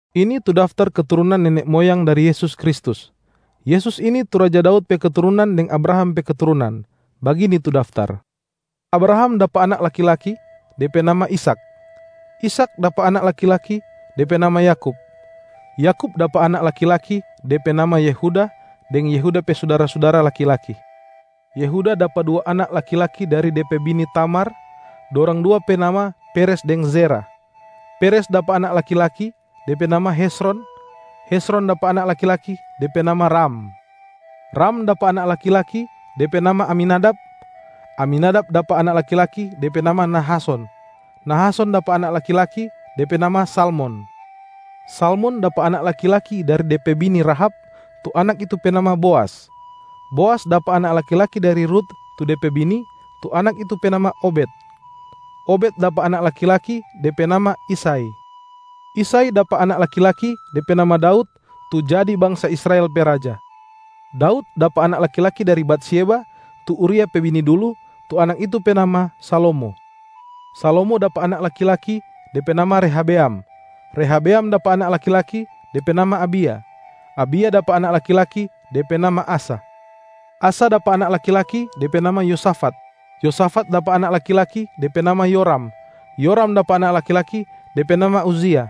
Ini tu daftar keturunan nene moyang dari Yesus Kristus. Yesus ini tu raja Daud pe keturunan deng Abraham pe keturunan. Bagini tu daftar: Abraham dapa anak laki-laki, de pe nama Ishak. Ishak dapa anak laki-laki, de pe nama Yakub. Yakub dapa anak laki-laki, de pe nama Yehuda deng Yehuda pe sudara-sudara laki-laki. Yehuda dapa dua anak laki-laki dari de pe bini Tamar, dorang dua pe nama Peres deng Zerah. Peres dapa anak laki-laki, de pe nama Hezron. Hezron dapa anak laki-laki, de pe nama Ram. Ram dapa anak laki-laki, de pe nama Aminadab. Aminadab dapa anak laki-laki, de pe nama Nahason. Nahason dapa anak laki-laki, de pe nama Salmon. Salmon dapa anak laki-laki dari de pe bini Rahab, tu anak itu pe nama Boas. Boas dapa anak laki-laki dari Rut tu de pe bini, tu anak itu pe nama Obed. Obed dapa anak laki-laki, de pe nama Isai. Isai dapa anak laki-laki, de pe nama Daud, tu jadi bangsa Israel pe raja. Daud dapa anak laki-laki dari Batsyeba, tu Uria pe bini dulu, tu anak itu pe nama Salomo. Salomo dapa anak laki-laki, de pe nama Rehabeam. Rehabeam dapa anak laki-laki, de pe nama Abia. Abia dapa anak laki-laki, de pe nama Asa. Asa dapa anak laki-laki, de pe nama Yosafat. Yosafat dapa anak laki-laki, de pe nama Yoram. Yoram dapa anak laki-laki, de pe nama Uzia.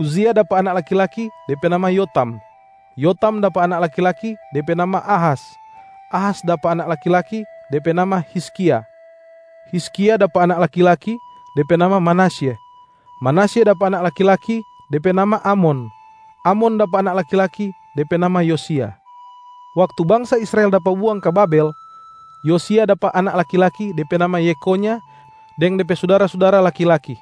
Uzia dapa anak laki-laki, de pe nama Yotam. Yotam dapa anak laki-laki, de pe nama Ahas. Ahas dapa anak laki-laki, de pe nama Hizkia. Hizkia dapa anak laki-laki, de pe nama Manasye. Manasye dapa anak laki-laki, de pe nama Amon. Amon dapa anak laki-laki, de pe nama Yosia. Waktu bangsa Israel dapa buang ka Babel, Yosia dapa anak laki-laki, de pe nama Yekhonya deng de pe sudara-sudara laki-laki.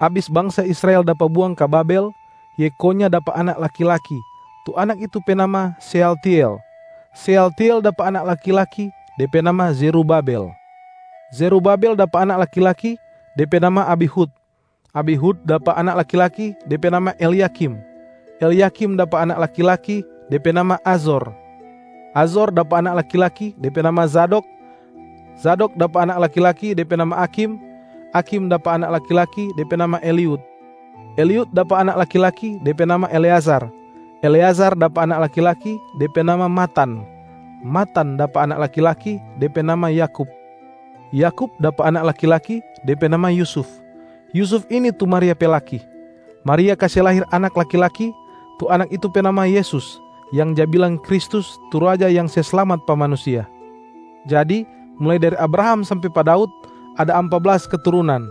Abis bangsa Israel dapa buang ka Babel, Yekhonya dapa anak laki-laki, tu anak itu pe nama Sealtiel. Sealtiel dapa anak laki-laki, de pe nama Zerubabel. Zerubabel dapa anak laki-laki, de pe nama Abihud. Abihud dapa anak laki-laki, de pe nama Elyakim. Elyakim dapa anak laki-laki, de pe nama Azor. Azor dapa anak laki-laki, de pe nama Zadok. Zadok dapa anak laki-laki, de pe nama Akhim. Akhim dapa anak laki-laki, de pe nama Eliud. Eliud dapa anak laki-laki, de pe nama Eleazar. Eleazar dapa anak laki-laki, de pe nama Matan. Matan dapa anak laki-laki, de pe nama Yakub. Yakub dapa anak laki-laki, de pe nama Yusuf. Yusuf ini tu Maria pe laki. Maria kase lahir anak laki-laki, tu Anak itu pe nama Yesus, yang ja bilang Kristus tu Raja yang se slamat pa manusia. Jadi mulai dari Abraham sampe pa Daud, ada ampa blas keturunan.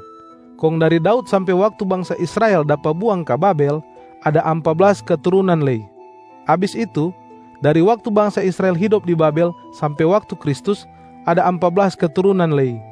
Kong dari Daud sampe waktu bangsa Israel dapa buang ka Babel, ada ampa blas keturunan lei. Abis itu, dari waktu bangsa Israel hidop di Babel sampe waktu Kristus, ada ampa blas keturunan lei.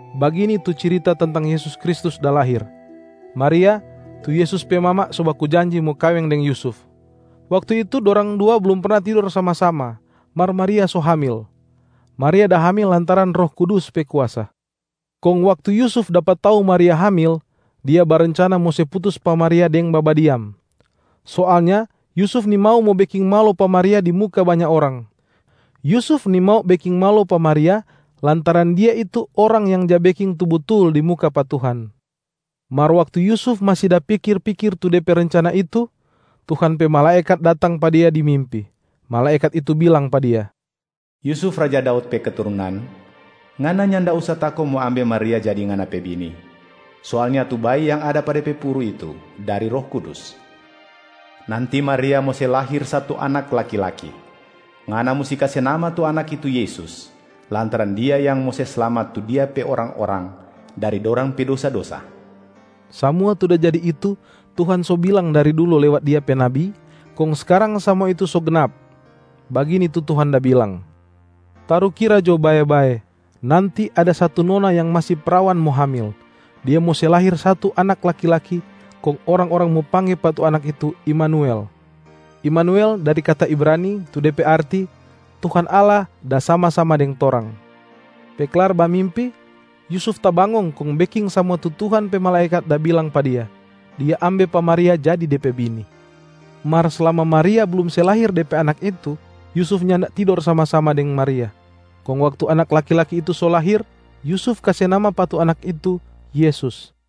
Bagini tu cirita tentang Yesus Kristus da lahir: Maria, tu Yesus pe mama so baku janji mo kaweng deng Yusuf. Waktu itu dorang dua blum perna tidor sama-sama, mar Maria so hamil. Maria da hamil lantaran Roh Kudus pe kuasa. Kong waktu Yusuf dapa tau Maria hamil, dia barencana mo se putus pa Maria deng babadiam. Soalnya Yusuf nimau mo beking malo pa Maria di muka banya orang. Yusuf nimau beking malo pa Maria lantaran dia itu orang yang ja beking tu butul di muka pa Tuhan. Mar waktu Yusuf masi da pikir-pikir tu de pe rencana itu, Tuhan pe malaekat datang pa dia di mimpi. Malaekat itu bilang pa dia, “Yusuf, raja Daud pe keturunan, ngana nyanda usa tako mo ambe Maria jadi ngana pe bini. Soalnya tu bayi yang ada pa de pe puru itu dari Roh Kudus. Nanti Maria mo se lahir satu anak laki-laki. Ngana musti kase nama tu anak itu Yesusa, lantaran Dia yang mo se slamat tu Dia pe orang-orang dari dorang pe dosa-dosa.” Samua tu da jadi itu Tuhan so bilang dari dulu lewat Dia pe nabi, kong skarang samua itu so gnap. Bagini tu Tuhan da bilang, “Tarukira jo bae-bae, nanti ada satu nona yang masi prawan mo hamil. Dia mo se lahir satu Anak laki-laki, kong orang-orang mo pangge pa tu Anak itu Imanuel.” (Imanuel dari kata Ibrani tu de pe arti: Tuhan Allah da sama-sama deng torang.) Pe klar bamimpi, Yusuf tabangong kong beking samua tu Tuhan pe malaekat da bilang pa dia. Dia ambe pa Maria jadi de pe bini. Mar slama Maria blum se lahir de pe Anak itu, Yusuf nyanda tidor sama-sama deng Maria. Kong waktu Anak laki-laki itu so lahir, Yusuf kase nama pa tu Anak itu, Yesus.